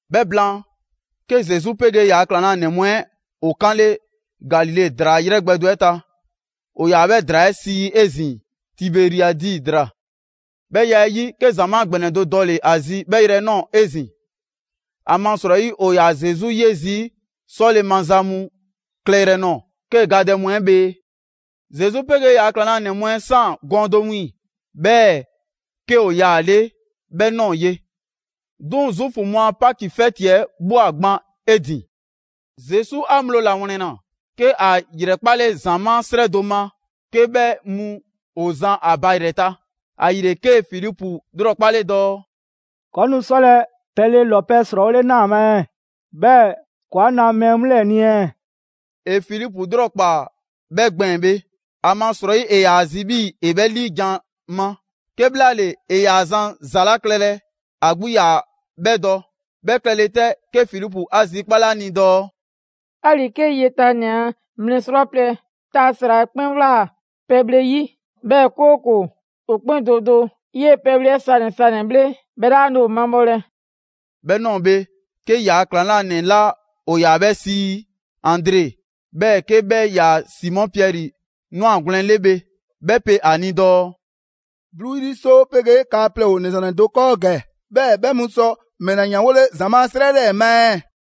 'Bhɛ blaan, 'ke Zesu 'pegee ‑yaa' ‑klaŋlanɛ mu 'ɛ ‑o 'kanle Galile ‑draa 'yrɛ gbɛ do 'ɛ ta. ‑O ‑yaa 'bhɛ ‑draa 'ɛ sii 'ezin‑ Tiberiadi ‑draa. 'Bhɛ ya 'ɛ 'yi, 'ke ‑zamaa' ‑gbɛnɛ do dɔle‑ ‑a zi 'bhɛ yrɛ 'ɛ ꞊nɔɔ 'ezin‑; ‑amasrɔyi ‑o ‑yaa Zesu 'ye zii' 'sɔle‑ maza mu klɛyrɛ nɔɔ‑ 'kee‑ gadɛ mu 'ɛ bhee. Zesu 'pegee ‑yaa' ‑klaŋlanɛ mu 'ɛ ꞊saan gɔɔn do wiiŋ‑, 'bhɛɛ‑ 'ke ‑o yaale' 'bhɛ ꞊nɔɔ ye. 'Duŋ‑ Zuufu mu a Paki 'fɛti 'ɛ ꞊bhwa gban 'e ‑din. Zesu a ŋgblo ‑lawlɛnle, 'ke ‑a ‑yrɛkpale ‑zamaa' 'srɛ do ma 'ke 'bhɛ mu ‑o zan ‑a ba ‑yrɛ ta; ‑ayile 'kee‑ Filipu 'lrɔkpale dɔɔ: «‑Kɔɔ' nu 'sɔlɛ‑ pɛle ‑lɔpɛ' ‑srɔɔwole 'naa ‑a ma ɛɛ, 'bhɛɛ‑ ‑kɔɔ 'a na mɛɛ mu 'lɛɛ‑ ni ɛɛ?» ‑E Filipu 'lrɔkpaa‑ 'bhɛ gbɛɛn‑ bhe, ‑amasrɔyi, ‑e ‑yaa zi 'bhii‑ ‑e 'bhɛ 'liijan‑ ma; 'kebhlaale, ‑e ‑yaa zan ‑za 'la klɛlɛ, ‑a 'gbu 'yaa‑ 'bhɛ dɔ. 'Bhɛ klɛle 'tɛ, 'ke Filipu 'a zikpale 'a ni dɔɔ: «'Ali‑ 'kee yetanɛ a mlɛ 'srwaplɛ‑ ta ‑sra 'ɛ 'kpɛn ꞊wlaa pɛbhle 'yi, 'bhɛɛ‑ 'kooko‑ ‑o 'kpɛn do do 'yee‑ pɛbhle 'ɛ sanɛ‑ sanɛ‑ bhle, 'bhɛ 'laa nu ‑o mabhɔlɛ.» 'Bhɛ ꞊nɔɔ bhe, 'ke ‑yaa' ‑klaŋlanɛ 'la ‑o ‑yaa 'bhɛ sii Andre, 'bhɛɛ 'ke 'bhɛ 'yaa‑ Simɔ Piɛri 'nwagwlɛn‑ 'le bhe, 'bhɛ pe ‑a ni dɔɔ: «'bluu 'yri 'soo 'pegee kaa plɛ ‑o ‑nɛ ‑zwannɛ do 'kɔɔ ‑gɛ. 'Bhɛɛ‑ 'bhɛ mu sɔ ‑mɛla ‑yanwole ‑zamaa' 'srɛ 'lɛɛ‑ ma ɛɛ?»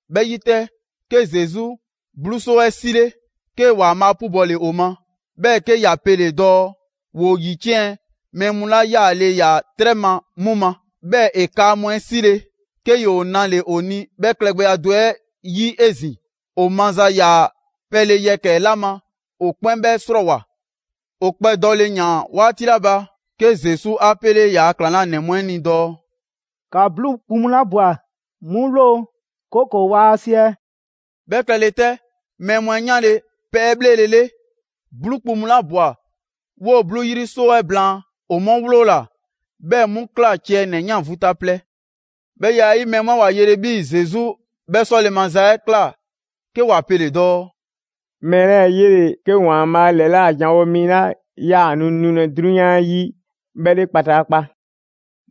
'Bhɛ 'yi 'tɛ, 'ke Zesu 'bluu 'soo 'ɛ 'sile‑, 'kee‑ ‑Waanbhaa' 'pubɔle ‑o ma, 'bhɛɛ‑ 'ke ‑ya pele‑ dɔɔ ‑woo ‑yiciɛn' mɛɛ mu 'la 'yaale‑ ‑yaa 'trɛ ma 'mu ma. 'Bhɛɛ‑ ‑e kaa mu 'ɛ 'sile‑, 'ke ‑yoo nale‑ ‑o ni 'bhɛ klɛgbɛya do 'ɛ 'yi 'ezin‑. ‑O maza ‑yaa pɛle yɛkɛ‑ 'la ma, ‑o 'kpɛn 'bhɛɛ‑ 'srɔɔwoa‑. ‑O kpɛdɔle ‑yaan 'waati 'la ba, 'ke Zesu 'a 'pele ‑yaa' ‑klaŋlanɛ mu 'ɛ ni dɔɔ: «‑Ka 'bluu kpu mu 'la ꞊bwa 'mu 'wloo‑, 'kooko‑ waa siɛ.» 'Bhɛ klɛle 'tɛ, mɛɛ mu 'ɛ 'yanle‑ pɛbhlelele, 'bluu kpu mu 'la ꞊bwa 'woo‑ 'bluu 'yri 'soo 'ɛ blaan'; ‑o 'mu 'wloola‑, 'bhɛɛ‑ 'mu ꞊kla ciɛ ‑nɛ 'yan vu ta plɛ. 'Bhɛ ya 'ɛ 'yi, mɛɛ mu 'ɛ ‑wa yele 'bhii‑ Zesu 'bhɛ 'sɔle‑ maza 'ɛ ꞊kla, 'ke ‑wa pele‑ dɔɔ: «Mɛɛ 'lɛɛ‑ 'yele‑ 'ke ‑Waanbhaa' ‑lɛla' janwo mi 'la 'yaa‑ nu nulɛ 'drunyan 'yi 'bhɛ 'le kpataakpa.»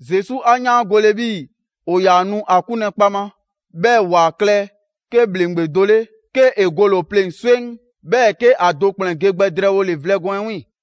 Zesu 'a 'yaangole 'bhii‑ ‑o ‑yaa nu ‑a 'kunlɛ‑ kpaŋma, 'bhɛɛ‑ ‑wa klɛ 'ke ‑bhleŋgbe do 'le, 'kee‑ gole‑ ‑o pleŋ‑ swɛŋ, 'bhɛɛ‑ 'ke ‑a do ‑kplɛn ge gbɛ drɛɛwole vlɛ gɔɔn 'ɛ 'wiiŋ‑.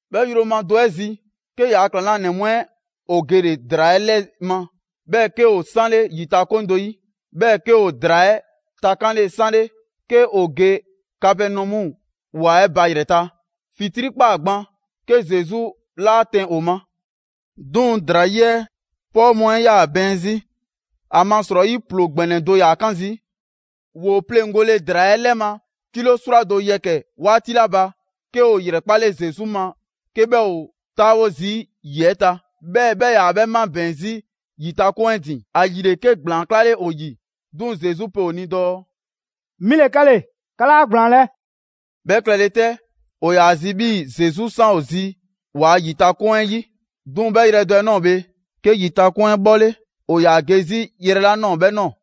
'Bhɛ yroma do 'ɛ zi, 'ke yaa ‑klaŋlanɛ mu 'ɛ ‑o gele‑ ‑draa 'ɛ 'lɛ ma. 'Bhɛɛ‑ 'ke ‑o 'sanle ‑yitakoŋ do 'yi, 'bhɛɛ‑ 'ke ‑o ‑draa 'ɛ takanle 'sanle 'ke ‑o ge Kapɛnɔmu ‑wa 'ɛ ba yrɛ ta. ‑Fitrii' ꞊kpaa gban, 'ke Zesu 'laa 'tɛn ‑o ma. 'Duŋ‑ ‑draa 'yi 'ɛ 'pɔɔ mu 'ɛ 'yaa‑ bɛɛn 'zi, ‑amasrɔyi ‑ploo ‑gbɛnɛ do ‑yaa 'kan zii'. ‑Woo pleŋgole ‑draa 'ɛ 'lɛ ma kilo 'srwado‑ yɛkɛ‑ 'yi 'waati 'la ba, 'ke ‑o ‑yrɛkpale Zesu ma 'ke 'bhɛ ‑o 'taawo zii' ‑yi 'ɛ ta, 'bhɛɛ‑ 'bhɛ 'yaa‑ 'bhɛ mabɛɛn‑ 'zi ‑yitakoŋ 'ɛ ‑din; ‑ayile 'ke ‑gblaan 'klale ‑o ‑yi. 'Duŋ‑ Zesu pe ‑o ni dɔɔ: «'Mi ‑le 'kɛle‑, 'ka 'laa ‑gblaanlɛ'!» 'Bhɛ klɛle 'tɛ, ‑o ‑yaa ‑a zi 'bhii‑ Zesu 'san ‑o zi ‑waa' ‑yitakoŋ 'ɛ 'yi. 'Duŋ‑ 'bhɛ yrɛ do 'ɛ ꞊nɔɔ bhe, 'ke ‑yitakoŋ 'ɛ 'bhɔle‑ ‑o ‑yaa ge 'zi yrɛ 'la ꞊nɔɔ 'bhɛ ꞊nɔɔ.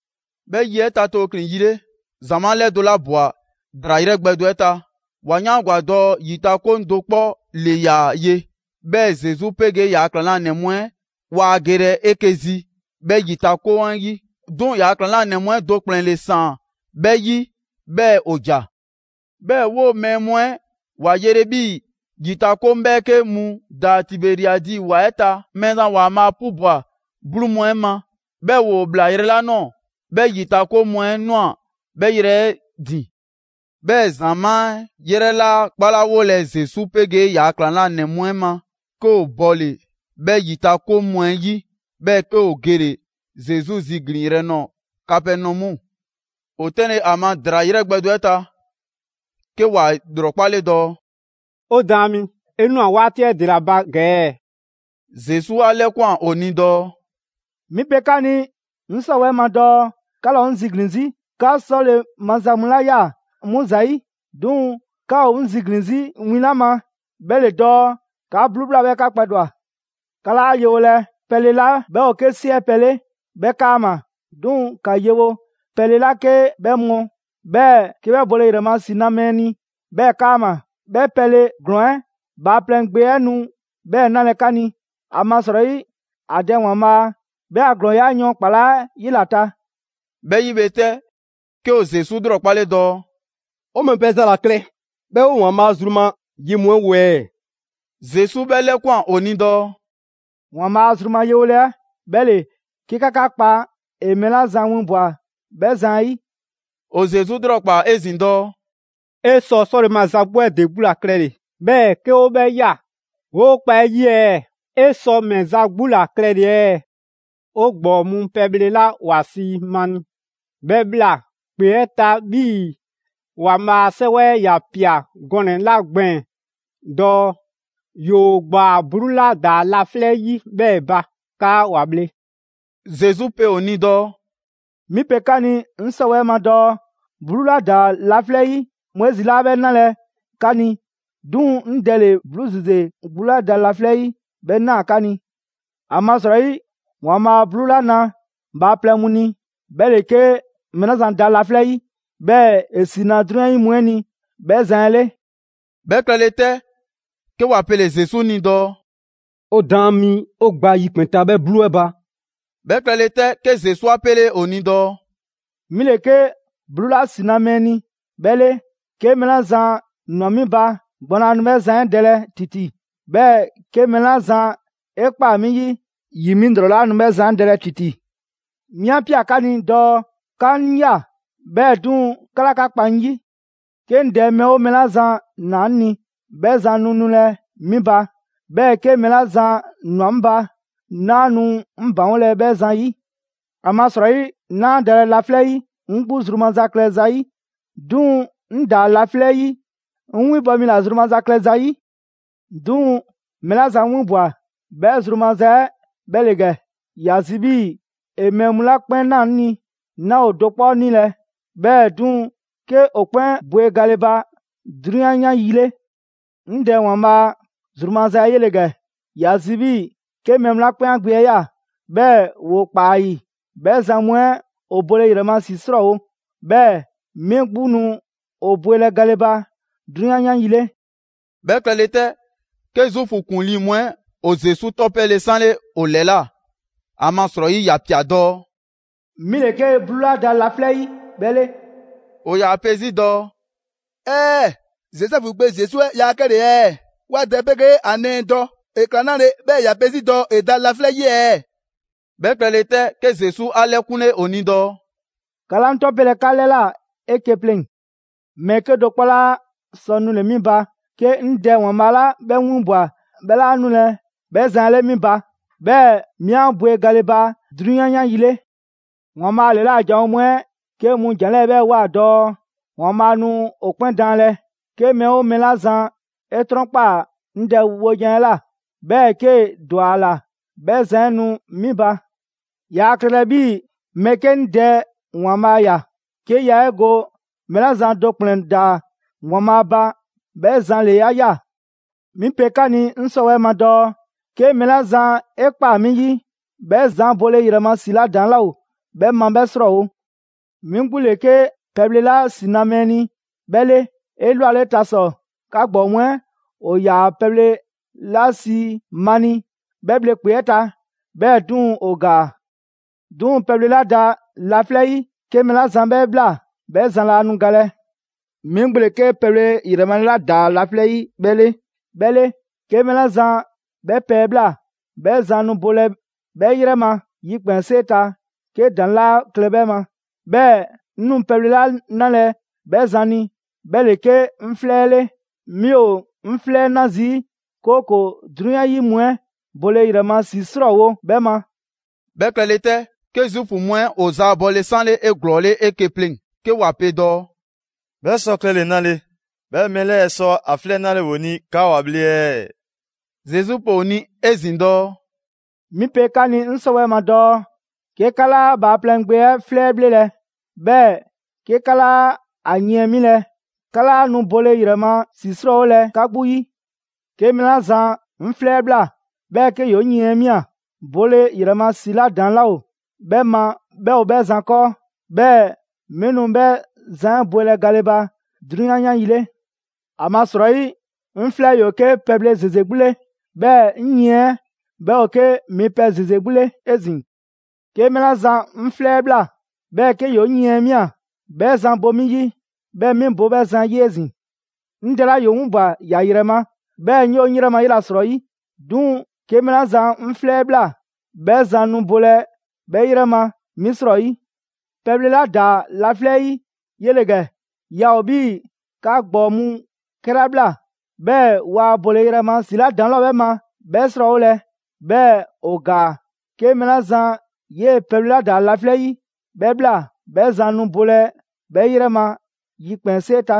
'Bhɛ yi 'ɛ ta tooklin‑ yi 'le, ‑zamaa' 'lɛdo‑ 'la ꞊bwa ‑draa 'yrɛ gbɛ do 'ɛ ta, ‑wa 'yaangwa‑ dɔɔ ‑yitakoŋ do 'kpɔ ‑le ‑yaa ye, 'bhɛɛ‑ Zesu 'pegee ‑yaa' ‑klaŋlanɛ mu 'ɛ waa gelɛ 'eke‑ zi 'bhɛ ‑yitakoŋ 'ɛ 'yi; 'duŋ‑ ‑yaa' ‑klaŋlanɛ mu 'ɛ do ‑kplɛn ‑le ‑saan 'bhɛ 'yi 'bhɛɛ‑ ‑o ‑ja. 'Bhɛɛ‑ 'woo‑ mɛɛ mu 'ɛ ‑wa yele 'bhii‑ ‑yitakoŋ 'bhɛɛke mu ‑daa Tiberiadi ‑wa 'ɛ ta, Mɛɛzan ‑Waanbhaa' 'pubwa‑ 'bluu mu 'ɛ ma, 'bhɛɛ‑ ‑woo ꞊bhla yrɛ 'la ꞊nɔɔ, 'bhɛ ‑yitakoŋ mu 'ɛ ꞊nwa 'bhɛ 'yrɛ 'ɛ ‑din. 'Bhɛɛ‑ ‑zamaa' 'yrɛ 'laa 'kpalawolɛ Zesu 'pegee ‑yaa' ‑klaŋlanɛ mu 'ɛ ma, 'ke ‑o bɔle‑ 'bhɛ ‑yitakoŋ mu 'ɛ 'yi, 'bhɛɛ‑ 'ke ‑o gele‑ Zesu ziglinyrɛ nɔɔ‑ Kapɛnɔmu. ‑O tɛnlɛ‑ ‑a ma ‑draa 'ɛ 'yrɛ gbɛ do 'ɛ ta, 'ke ‑wa ‑lrɔkpale dɔɔ: «'O Daan mi, 'e ꞊nwa 'waati 'ɛ ‑dela ba ‑gɛ ɛɛ?» Zesu 'a 'lɛkwan‑ ‑o ni dɔɔ: «'Mi pe 'ka ni 'ŋ 'sɔwɛɛ‑ ma dɔɔ 'ka 'laa ‑o 'ŋ ziglin‑ 'zi 'ka 'sɔle‑ maza mu 'la ꞊ya 'mu ‑zayi', 'duŋ‑ 'ka ‑o 'ŋ ziglin‑ 'zi win 'la ma 'bhɛ ‑le dɔɔ 'ka 'bluu ꞊bhla, 'bhɛɛ‑ 'ka kpɛdwa‑. 'Ka 'laa yewolɛ pɛle 'la 'bhɛ ‑o 'ke 'siɛpɛ‑ 'le 'bhɛ 'kaama‑, 'duŋ‑ ‑ka yewo pɛle 'la 'ke 'bhɛ mɔ, 'bhɛɛ‑ 'ke 'bhɛ bole ‑yrɛ ma ‑si na mɛɛ ni 'bhɛɛ 'kaama‑. 'Bhɛ pɛle ‑glɔɔn 'ɛ Bhaaplɛŋ Gbe 'ɛ nu 'bhɛɛ‑ 'nalɛ‑ 'ka ni. ‑Amasrɔyi ‑a Dɛ ‑Waanbhaa' 'bhɛ a ‑glɔɔya' yɔɔn ‑kpalaa' 'yela‑ ta.» 'Bhɛ 'yi bhe 'tɛ, 'ke ‑o Zesu 'lrɔkpale dɔɔ: «'O ‑mɛ pɛ za ‑la klɛ, 'bhɛɛ‑ 'o ‑Waanbhaa' zru ma ye mu 'ɛ wo ɛɛ?» Zesu 'bhɛ 'lɛkwan‑ ‑o ni dɔɔ: «‑Waanbhaa' a zru ma yewole 'ɛ 'bhɛ ‑le 'ke 'ka 'ka 'kpa ‑e mɛɛ 'la zan winbwa‑ 'bhɛ zan 'ɛ 'yi.» ‑O Zesu 'lrɔkpaa‑ 'ezin‑ dɔɔ: «'E sɔ 'sɔle‑ maza 'gbu 'ɛ ‑de 'gbu ‑la klɛle‑, 'bhɛɛ‑ 'ke 'o 'bhɛ ꞊ya, 'woo kpa 'e 'yi ɛɛ? 'E sɔ ‑mɛ za 'gbu ‑la klɛle‑ ɛɛ? 'O ‑gbɔɔ mu pɛbhle 'la ‑wa sii mani 'bhɛ꞊bhla ‑kpe 'ɛ ta 'bhii‑ ‑Waanbhaa' a 'Sɛwɛ 'ɛ ‑ya ‑pia gɔnɛ‑ 'la gbɛɛn‑ dɔɔ: ‹‑Yoo ‑gbaa 'bluu 'la ‑daa laflɛ' 'yi 'bhɛɛ‑ ba 'kaa ‑wa bhle.›» Zesu pe ‑o ni dɔɔ: «'Mi pe 'ka ni 'ŋ 'sɔwɛɛ‑ ma dɔɔ 'bluu 'la ‑daa laflɛ' 'yi Moizi 'laa 'bhɛ 'nalɛ‑ 'ka ni. 'Duŋ‑ 'ŋ Dɛ ‑le 'bluu ‑zeze 'gbu 'la da laflɛ' 'yi 'bhɛɛ‑ na 'ka ni. ‑Amasrɔyi ‑Waanbhaa' 'bluu 'la na bhaaplɛŋ mu ni, 'bhɛ ‑le 'ke mɛɛ 'la zan da laflɛ' 'yi, 'bhɛɛ‑ ‑e ‑si na 'drunyan 'yi mu 'ɛ ni 'bhɛ zan 'ɛ 'le.» 'Bhɛ klɛle 'tɛ, 'ke ‑wa pele‑ Zesu ni dɔɔ: «'O Daan mi, 'o gba yikpɛn‑ ta 'bhɛ 'bluu 'ɛ ba.» 'Bhɛ klɛle 'tɛ, 'ke Zesu 'a 'pele ‑o ni dɔɔ: «'Mi ‑le 'ke 'bluu 'la ‑si na mɛɛ ni 'bhɛ 'le. 'Ke mɛɛ 'la zan ‑nwa 'mi ba, gbɔn laa nu 'bhɛ zan 'ɛ dɛlɛ ‑titi. 'Bhɛɛ‑ 'ke mɛɛ 'la zan 'e ꞊kpaa 'mi 'yi, ‑yi 'mi ‑lrɔ 'laa nu 'bhɛ zan 'ɛ dɛlɛ ‑titi. 'Mi 'a ꞊pia 'ka ni dɔɔ 'ka 'ŋ ꞊ya, 'bhɛɛ‑ 'duŋ‑ 'ka 'laa 'ka kpa 'ŋ 'yi. 'Ke 'ŋ Dɛ mɛɛ 'oo mɛɛ 'la zan ‑naa 'ŋ ni, 'bhɛ zan nu nulɛ 'mi ba. 'Bhɛɛ‑ 'ke mɛɛ 'la zan ‑nwa 'ŋ ba, 'naa nu 'ŋ ‑baŋgolɛ 'bhɛ zan 'ɛ 'yi. ‑Amasrɔyi 'naa dalɛ laflɛ' 'yi 'ŋ 'gbu zru maza klɛ zayi', 'duŋ‑ 'ŋ ‑daa laflɛ' 'yi 'ŋ 'winbɔ‑ mi ‑la zru maza klɛ zayi'. 'Duŋ‑ mɛɛ 'la zan 'ŋ 'winbwa‑, 'bhɛ zru maza 'ɛ 'bhɛ ‑le ‑gɛ: ‑Ya zi 'bhii‑ ‑e mɛɛ mu 'la 'kpɛn 'naa‑ 'ŋ 'ni, 'naa ‑o do 'kpɔ 'nilɛ‑, 'bhɛɛ‑ 'duŋ‑ 'ke ‑o 'kpɛn bwe gale ba 'drunyan 'yan yi 'le. 'Ŋ Dɛ ‑Waanbhaa' zru maza 'ɛ 'yele‑ ‑gɛ: ‑Ya zi 'bhii‑ 'ke mɛɛ mu 'la 'kpɛn ‑a Gbe 'ɛ ꞊ya, 'bhɛɛ‑ ‑woo ‑kpaa ‑a ‑yi, 'bhɛ zan mu 'ɛ ‑o bole ‑yrɛ ma ‑si 'ɛ 'srɔɔwo‑; 'bhɛɛ‑ 'mi 'gbu nu ‑o bwelɛ gale ba 'drunyan 'yan yi 'le.» 'Bhɛ klɛle 'tɛ, 'ke Zuufu ‑kuŋlii mu 'ɛ ‑o Zesu 'tɔpele 'sanle ‑o ‑lɛla', ‑amasrɔyi ‑ya ‑pia dɔɔ: «'Mi ‑le 'ke 'bluu 'la ‑daa laflɛ' 'yi 'bhɛ 'le.» ‑O ‑yaa 'pe 'zi dɔɔ: «‑Ɛɛ'! Zozɛfu gbe Zesu 'ɛ yaa 'kɛle‑ ɛɛ? 'Wa dɛ 'pegee ‑a nɛɛ dɔ, ‑e ꞊kla 'nale‑ 'bhɛɛ‑ ‑ya pe 'zi dɔɔ ‑e ‑daa laflɛ' 'yi ɛɛ?» 'Bhɛ klɛle 'tɛ, 'ke Zesu 'a 'lɛkunle ‑o ni dɔɔ: «‑Ka 'laa 'ŋ 'tɔpelɛ 'ka 'lɛla 'eke‑ pleŋ‑. Mɛɛ 'kedo‑ 'kpɔ 'laa sɔ nule‑ 'mi ba, 'ke 'ŋ Dɛ ‑Waanbhaa' 'la 'bhɛ 'ŋ 'winbwa‑ 'bhɛ 'laa 'nulɛ‑ 'bhɛ zan 'ɛ 'le 'mi ba, 'bhɛɛ‑ 'mi 'a bwe gale ba 'drunyan 'yan yi 'le. ‑Waanbhaa' ‑lɛla' janwo mu 'ɛ 'ke mu ‑jan 'lɛɛ‑ 'bhɛ ꞊woa dɔɔ: ‹‑Waanbhaa' nu ‑o 'kpɛn daanlɛ.› 'Ke mɛɛ 'oo mɛɛ 'la zan 'e 'trɔnkpaa‑ 'ŋ Dɛ wojan 'ɛ ꞊la, 'bhɛɛ‑ 'kee‑ ‑dwa ‑a ‑la, 'bhɛ zan 'ɛ nu 'mi ba. Yaa klɛlɛ 'bhii‑ mɛɛ 'ke 'ŋ Dɛ ‑Waanbhaa' ꞊ya, 'ke yaa 'e go mɛɛ 'la zan do ‑kplɛn ‑daa ‑Waanbhaa' ba 'bhɛ zan ‑le 'a ꞊ya.» «'Mi pe 'ka ni 'ŋ 'sɔwɛɛ‑ ma dɔɔ: 'ke mɛɛ 'la zan 'e ꞊kpaa 'mi 'yi, 'bhɛ zan bole ‑yrɛ ma ‑si 'la ‑daŋ' 'laa ‑o 'bhɛ ma 'bhɛ 'srɔɔwo‑. 'Mi 'gbu ‑le 'ke pɛbhle 'la ‑si na mɛɛ ni 'bhɛ 'le. 'Elwaleta ‑sɔ, 'ka ‑gbɔɔ mu 'ɛ ‑o ‑yaa pɛbhle 'la sii mani 'bhɛ bhle ‑kpe 'ɛ ta, 'bhɛɛ‑ 'duŋ‑ ‑o ‑gaa. 'Duŋ‑ pɛbhle 'la ‑daa laflɛ' 'yi 'ke mɛɛ 'la zan 'bhɛ ꞊bhla, 'bhɛ zan laa nu galɛ. 'Mi 'gbu ‑le 'ke pɛbhle 'yrɛ male 'la ‑daa laflɛ' 'yi 'bhɛ 'le. 'Ke mɛɛ 'la zan 'bhɛ pɛ 'ɛ ꞊bhla, 'bhɛ zan nu bolɛ 'bhɛ 'yrɛ ma yikpɛnsee ta 'ke ‑daŋ' 'laa klɛ 'bhɛ ma. 'Bhɛɛ‑ 'ŋ nu pɛbhle 'la 'nalɛ 'bhɛ zan ni, 'bhɛ ‑le 'ke 'ŋ 'flɛ 'ɛ 'le. 'Mi ‑o 'ŋ 'flɛ 'ɛ 'na zii', 'kooko‑ 'drunyan 'yi mu 'ɛ bole ‑yrɛ ma ‑si 'srɔɔwo‑ 'bhɛ ma.» 'Bhɛ klɛle 'tɛ, 'ke Zuufu mu 'ɛ ‑o ‑zaabɔle 'sanle 'eglɔɔle 'eke‑ pleŋ‑, 'ke ‑wa pe dɔɔ: «'Bhɛ sɔ klɛle‑ 'nale‑ 'bhɛɛ‑ mɛɛ 'lɛɛ‑ sɔ ‑a 'flɛ 'ɛ 'nale 'o ni 'kaa 'wa 'bhle ɛɛ?» Zesu pe ‑o ni 'ezin‑ dɔɔ: «'Mi pe 'ka ni 'ŋ 'sɔwɛɛ‑ ma dɔɔ: 'ke 'ka 'laa Bhaaplɛŋ Gbe 'ɛ 'flɛ 'ɛ 'bhlelɛ‑, 'bhɛɛ‑ 'ke 'ka 'laa ‑a yiɛn 'milɛ‑, 'ka 'laa nu bole ‑yrɛ ma ‑si 'srɔɔwolɛ 'ka 'gbu 'yi. 'Ke mɛɛ 'la zan 'ŋ 'flɛ 'ɛ ꞊bhla, 'bhɛɛ‑ 'ke ‑yoo 'ŋ yiɛn 'ɛ 'mia‑, bole ‑yrɛ ma ‑si 'la ‑daŋ' 'laa ‑o 'bhɛ ma 'bhɛ ‑o 'bhɛ zan 'kɔɔ; 'bhɛɛ‑ 'mi nu 'bhɛ zan 'ɛ bwelɛ gale ba 'drunyan 'yan yi 'le. ‑Amasrɔyi, 'ŋ 'flɛ ‑yoo 'ke pɛbhle ‑zeze 'gbu 'le, 'bhɛɛ‑ 'ŋ yiɛn 'ɛ 'bhɛ ‑o 'ke mipɛ ‑zeze 'gbu 'le 'ezin‑. 'Ke mɛɛ 'la zan 'ŋ 'flɛ 'ɛ ꞊bhla, 'bhɛɛ‑ 'ke ‑yoo 'ŋ yiɛn 'ɛ 'mia‑, 'bhɛ zan bo 'mi 'yi, 'bhɛɛ‑ 'mi bo 'bhɛ zan 'ɛ ‑yi 'ezin‑. 'Ŋ Dɛ 'la ‑yoo 'ŋ 'winbwa‑ ‑ya ‑yrɛ ma, 'bhɛɛ‑ 'ŋ 'yoo‑ 'ŋ 'yrɛ ma 'yela‑ 'srɔyi. 'Duŋ‑ 'ke mɛɛ 'la zan 'ŋ 'flɛ 'ɛ ꞊bhla, 'bhɛ zan nu bolɛ 'bhɛ 'yrɛ ma 'mi 'srɔyi. Pɛbhle 'la ‑daa laflɛ 'yi 'yele‑ ‑gɛ. Yaa ‑o 'bhii‑ 'ka ‑gbɔɔ mu 'kɛla ꞊bhla, 'bhɛɛ‑ waa bole ‑yrɛ ma ‑si 'la ‑daŋ' 'laa ‑o 'bhɛ ma 'bhɛ 'srɔɔwolɛ, 'bhɛɛ‑ ‑o ‑gaa. 'Ke mɛɛ 'la zan 'yee‑ pɛbhle 'la ‑daa laflɛ' 'yi 'bhɛ ꞊bhla, 'bhɛ zan nu bolɛ 'bhɛ 'yrɛ ma yikpɛnsee ta.»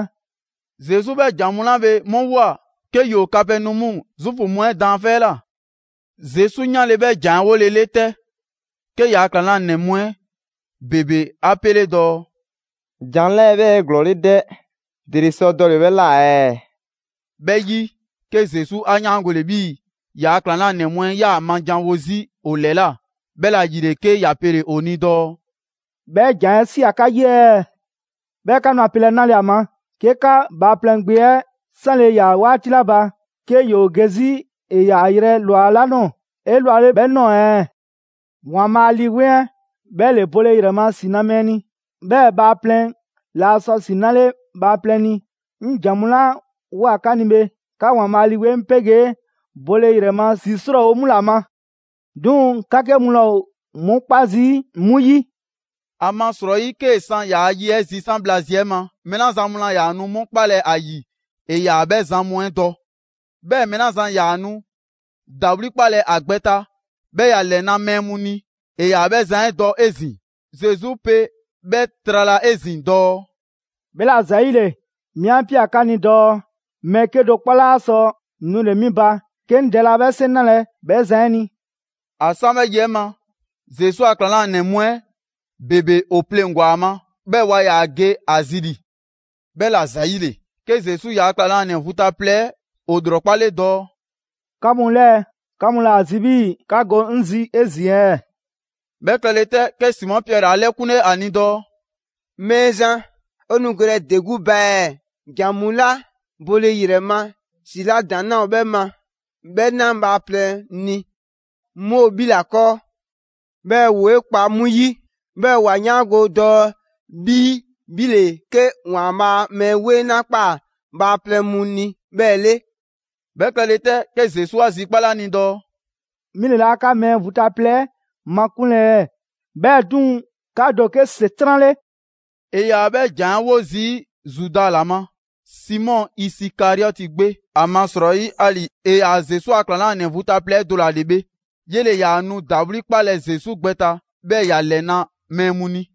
Zesu 'bhɛ ‑jan mu 'la bhe 'mu ꞊woa 'ke ‑yoo Kapɛnɔmu Zuufu mu 'ɛ daanfɛ' 'ɛ ꞊la. Zesu 'yanle‑ 'bhɛ ‑jan 'ɛ 'wolele 'tɛ, 'ke ‑yaa' ‑klaŋlanɛ mu 'ɛ ‑bebe 'a 'pele dɔɔ: «‑Jan 'lɛɛ‑ 'bhɛ ‑o 'eglɔɔle 'dɛ, ‑dele sɔ dɔle‑ 'bhɛ ꞊la ɛɛ?» 'Bhɛ 'yi, 'ke Zesu 'a 'yaangole 'bhii‑ ‑yaa' ‑klaŋlanɛ mu 'ɛ 'yaa‑ ‑a ma janwo 'zi ‑o ‑lɛla'. 'Bhɛla‑ ‑yile, 'ke ‑ya pele‑ ‑o ni dɔɔ: «'Bhɛ ‑jan 'ɛ ꞊sia 'ka 'yi ɛɛ? 'Bhɛɛ‑ 'ka nu ‑a pelɛ 'nale‑ ‑a ma, 'ke 'ka Bhaaplɛŋ Gbe 'ɛ 'sanle ꞊ya 'waati 'la ba, 'ke ‑yoo ge 'zi ‑e ‑yaa yrɛ ꞊lwa 'la ꞊nɔɔ 'elwale 'bhɛ ꞊nɔɔ ɛɛ? ‑Waanbhaa' Lii 'Weŋ 'ɛ 'bhɛ ‑le bole ‑yrɛ ma ‑si 'na mɛɛ ni, 'bhɛɛ‑ bhaaplɛŋ laa sɔ ‑si 'nale bhaaplɛŋ ni. 'Ŋ ‑jan mu 'la ꞊woa 'ka ni bhe, 'ka ‑Waanbhaa' Lii 'Weŋ 'pegee bole ‑yrɛ ma ‑si 'srɔɔwo‑ 'mu ‑la ma. 'Duŋ‑ 'ka 'ke mu laa ‑o 'mu 'kpa zii' 'mu 'yi.» ‑Amasrɔyi 'kee‑ san ‑yaa' ye 'ɛ zisan' bhla zi 'ɛ ma, mɛɛ 'la zan mu laa ‑yaa nu 'mu 'kpalɛ‑ ‑a ‑yi ‑e ‑yaa 'bhɛ zan mu 'ɛ dɔ; 'bhɛɛ‑ mɛɛ 'la zan ‑yaa nu ‑dawli' 'kpalɛ‑ ‑a gbɛ ta, 'bhɛɛ‑ ‑ya ‑lɛna' mɛɛ mu ni; ‑e ‑yaa 'bhɛ zan 'ɛ dɔ 'ezin‑. Zesu pe 'bhɛ trala 'ezin‑ dɔɔ: «'Bhɛla‑ ‑zayile 'mi 'a ꞊pia 'ka ni dɔɔ mɛɛ 'kedo‑ 'kpɔ 'laa sɔ nule‑ 'mi ba, 'ke 'ŋ Dɛ laa 'bhɛ 'seŋ 'nalɛ‑ 'bhɛ zan 'ɛ ni.» ‑A 'san 'bhɛ yi 'ɛ ma, Zesu ‑a ‑klaŋlanɛ mu 'ɛ ‑bebe ‑o pleŋgwa‑ ‑a ma, 'bhɛɛ‑ waa ‑yaa ge a zi ‑li. 'Bhɛla‑ ‑zayile, 'ke Zesu ‑yaa' ‑klaŋlanɛ vu ta plɛ 'ɛ ‑o ‑lrɔkpale dɔɔ: «'Ka mu 'lɛɛ, 'ka mu laa ‑a zi 'bhii‑ 'ka go 'ŋ zi 'ezin‑ ɛɛ?» 'Bhɛ klɛle 'tɛ, 'ke Simɔ Piɛri 'a 'lɛkunle 'a ni dɔɔ: «Mɛɛzan, 'o nu gelɛ ‑de 'gbu ba ɛɛ? ‑Jan mu 'la bole ‑yrɛ ma ‑si 'la ‑daŋ' 'laa ‑o 'bhɛ ma 'bhɛ na bhaaplɛŋ ni 'mu ‑o 'bhi 'la 'kɔɔ. 'Bhɛɛ‑ 'woo ꞊kpaa 'mu 'yi, 'bhɛɛ‑ 'wa 'yaango‑ dɔɔ 'bhii‑ 'bhi ‑le 'ke ‑Waanbhaa' Mɛɛ 'Weŋ 'la ꞊kpaa bhaaplɛŋ mu ni 'bhɛ 'le.» 'Bhɛ klɛle 'tɛ, 'ke Zesu 'a zikpale 'a ni dɔɔ: «'Mi ‑le 'laa 'ka mɛɛ vu ta plɛ 'ɛ makunlɛ ɛɛ? 'Bhɛɛ‑ 'duŋ‑, 'ka do ‑o 'ke ‑Setran' 'le!» ‑E ‑yaa 'bhɛ ‑jan 'ɛ 'wo zii' Zuda ‑la ma, Simɔ Isikariɔti gbe, ‑amasrɔyi 'ali‑ ‑e ‑yaa Zesu a ‑klaŋlanɛ vu ta plɛ do ‑la 'le bhe, 'yele‑ ‑yaa nu ‑dawli' 'kpalɛ‑ Zesu gbɛ ta, 'bhɛɛ‑ ‑ya ‑lɛna' mɛɛ mu ni.